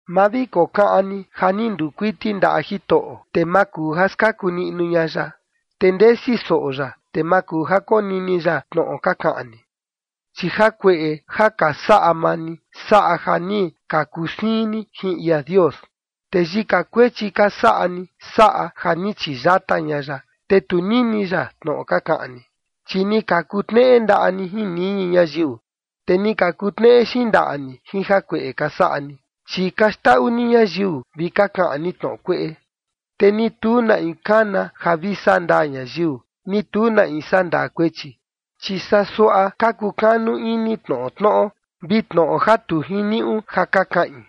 Ma vi kokaꞌan ni ja ni nduu kuiti ndaꞌa Jitoꞌo, te ma kuu ja skaku niꞌnu ña ya, te ndesi soꞌo ya, te ma kuu ja konini ya tnoꞌo ka kaꞌan ni. Chi jakueꞌe ja ka saꞌa maa ni saꞌa ja ni ka kusiin ni jin ia Dios, te yika kuechi ka saꞌa ni saꞌa ja ni chiyata ña ya, te tu nini ya tnoꞌo ka kaꞌan ni. Chi ni ka kutneꞌe ndaꞌa ni jin niñi ñayiu, te ni ka kutneꞌe xindaꞌa ni jin jakueꞌe ka saꞌa ni, chi ka xndaꞌu ni ñayiu vi ka kaꞌan ni tnoꞌo kueꞌe. Te ni tu na in kana ja vi saꞌa ndaa ñayiu, ni tu na in sandaa kuechi, chi saa suaꞌa ka kukanu ini tnoꞌo tnoꞌo, vi tnoꞌo ja tu jiniuꞌu ja ka kaꞌin.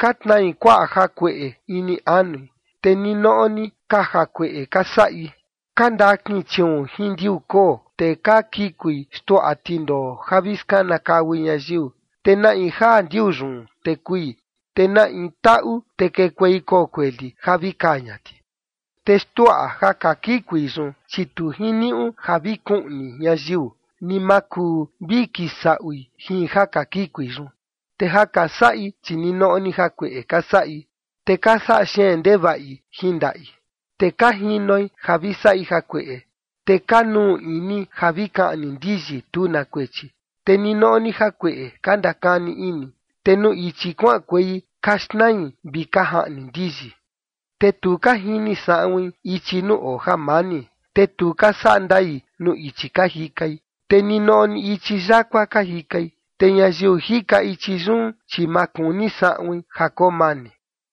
Ka tnai kuaꞌa jakueꞌe ini anui, te ninoꞌo ni ka jakueꞌe ka saꞌi. Ka ndakin chiuun jin ndiuu koo, te ka kikui xtuaꞌa tindoo ja vi skanakaui ñayiu. Te na in jaa ndiuu yun, te kui, te na in taꞌu, te kekuei koo kueli ja vi kaa ña ti. Te xtuaꞌa ja ka kikui yun, chi tu jiniuꞌu ja vi kuiꞌnu ñayiu, ni ma kuu vi kisaꞌui jin ja ka kikui yun. Te ja ka saꞌi, chi ninoꞌo ni jakueꞌe ka saꞌi, te ka saꞌa xeen ndevaꞌi jin ndaꞌi. Te ka jinoi ja vi saꞌi jakueꞌe, te ka nuu ini ja vi kaꞌni ndiyi tu na kuechi. Te ninoꞌo ni jakueꞌe ka ndakani ini, te nuu ichi kuaꞌankuei ka xnai vi ka jaꞌni ndiyi. Te tu ka jini saꞌuin ichi nuu oo jamani, te tu ka saꞌa ndai nuu ichi ka jikai, te ninoꞌo ni ichi yakua ka jikai, te ñayiu jika ichi yun, chi ma kuni saꞌuin ja koo mani.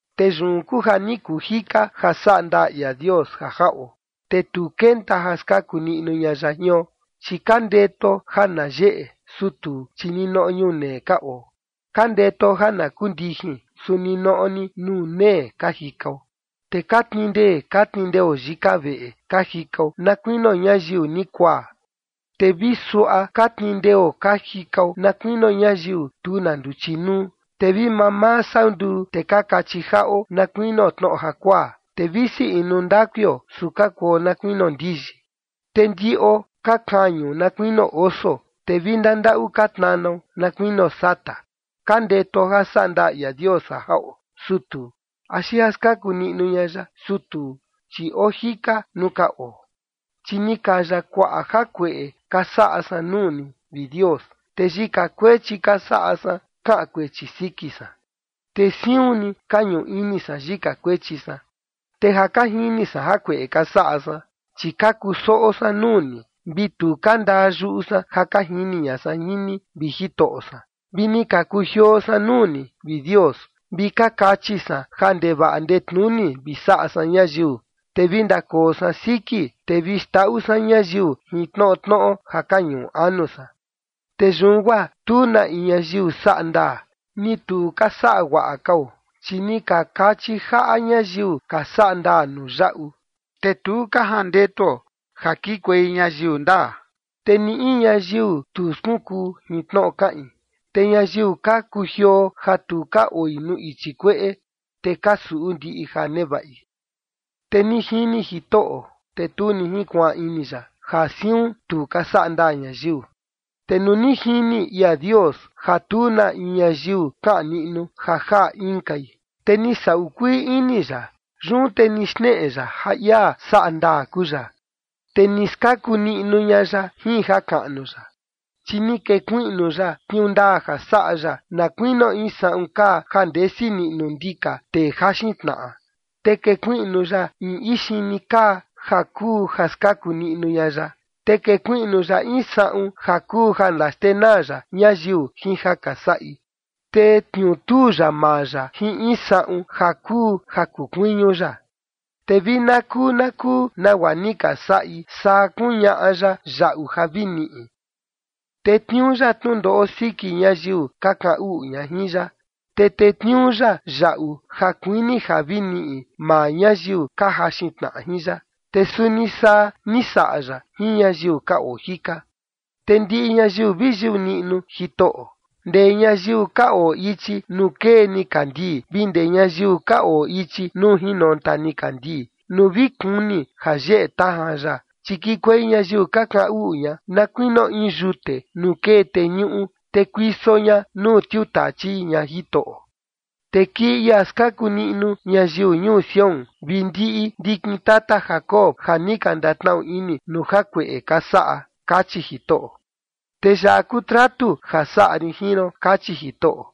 Te yun kuu ja ni kuu jika ja saꞌa ndaa ia Dios ja jaꞌo, te tu kenta ja skaku niꞌnu ña ya jion, chi ka ndetuo ja na yeꞌe, su tuu, chi ninoꞌo ñunee ka oo, ka ndetuo ja na kuu ndijin, su ninoꞌo ni nuu nee ka jikao. Te ka tnii ndee ka tnii ndeo yika veꞌe ka jikao na kuinio ñayiu ni kuaa, te vi suaꞌa ka tnii ndeo ka jikao na kuinio ñayiu tu na nduchi nuu, te vi mamaa sau nduu, te ka kachi jaꞌo na kuinio tnoꞌo jakuaa, te visi inu ndakuio, su ka kuo na kuinio ndiyi. Te ndiꞌo ka kañu na kuinio oso, te vi ndandaꞌu ka tnanao na kuinio sata. Ka ndetuo ja saꞌa ndaa ia Dios ja jaꞌo, su tuu, axi ja skaku niꞌnu ña ya, su tuu, chi oo jika nuu ka oo. Chi ni kaya kuaꞌa jakueꞌe ka saꞌa san nuu ni, vi Dios, te yika kuechi ka saꞌa san kaꞌan kuechi siki san. Te siun ni ka ñuꞌu ini san yika kuechi san, te ja ka jini san jakueꞌe ka saꞌa san. Chi ka kusoꞌo san nuu ni, vi tu ka ndaa yuꞌu san ja ka jini ña san jin ni, vi Jitoꞌo san. Vi ni ka kujioo san nuu ni, vi Dios, vi ka kachi san ja ndevaꞌa ndetnuni vi saꞌa san ñayiu, te vi ndakoo san siki, te vi xndaꞌu san ñayiu jin tnoꞌo tnoꞌo ja ka ñuꞌu anu san. Te yun guaa tu na in ñayiu saꞌa ndaa, ni tu ka saꞌa guaꞌa kao, chi ni ka kachi jaꞌa ñayiu ka saꞌa ndaa nuu yaꞌu, te tu ka jandetuo ja kikuei ñayiu ndaa. Te ni in ñayiu, tu skunkuu jin tnoꞌo kaꞌin te ñayiu ka kujioo ja tu ka oi nuu ichi kueꞌe, te ka suꞌu ndiꞌi ja nevaꞌi. Te ni jini Jitoꞌo, te tu ni jinkuaan ini ya ja siun tu ka saꞌa ndaa ñayiu. Te nuu ni jini ia Dios ja tu na in ñayiu kaꞌan niꞌnu ja jaꞌa inkai, te ni saꞌu kuii ini ya. Yun te ni xneꞌe ya ja ia saꞌa ndaa kuu ya, te ni skaku niꞌnu ña ya jin jakaꞌnu ya. Chi ni kekuiꞌnu ya tniuu ndaa ja saꞌa ya na kuinio in saꞌun kaa ja ndesi niꞌnu ndika tee jaxin tnaꞌa. Te kekuiꞌnu ya in ixini kaa ja kuu ja skaku niꞌnu ña ya. Te kekuiꞌnu ya in saꞌun ja kuu ja ndaxtenaa ya ñayiu jin ja ka saꞌi, te tniutuu ya maa ya jin in saꞌun ja kuu ja kukuiñu ya. Te vi na kuu na kuu nagua ni ka saꞌi, saa kuñaꞌa ya yaꞌu ja vi niꞌi. Tetniuu ya tnundoꞌo siki ñayiu ka kaꞌan uꞌu ña jin ya, te tetniuu ya yaꞌu ja kuini ja vi niꞌi maa ñayiu ka jaxin tnaꞌa jin ya. Te suni saa ni saꞌa ya jin ñayiu ka oo jika. Te ndiꞌi ñayiu vi yuꞌu niꞌnu Jitoꞌo, ndee ñayiu ka oo ichi nuu kee nikandii vi ndee ñayiu ka oo ichi nuu jinonta nikandii, nuu vi kuni ja yeꞌe tajan ya. Chi kikuei ñayiu ka kaꞌan uꞌu ña, na kuinio in yute nuu kee teñuꞌu, te kuiso ña nuu tiutachi ña Jitoꞌo. “Te kii ia skaku niꞌnu ñayiu ñuu Sión vi ndiꞌi ndikin tata Jacob ja ni ka ndatnaꞌu ini nuu jakueꞌe ka saꞌa”, kachi Jitoꞌo. “Te yaꞌa kuu tratu ja saꞌa rin jin ron”, kachi Jitoꞌo,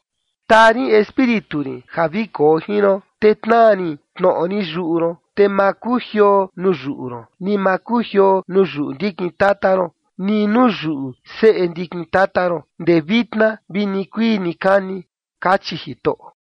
“Taa rin Espíritu rin ja vi koo jin ron, te tnaa rin tnoꞌo rin yuꞌu ron, te ma kujioo nuu yuꞌu ron, ni ma kujioo nuu yuꞌu ndikin tata ron, ni nuu yuꞌu seꞌe ndikin tata ron, ndee vitna vi nikuii nikani”, kachi Jitoꞌo.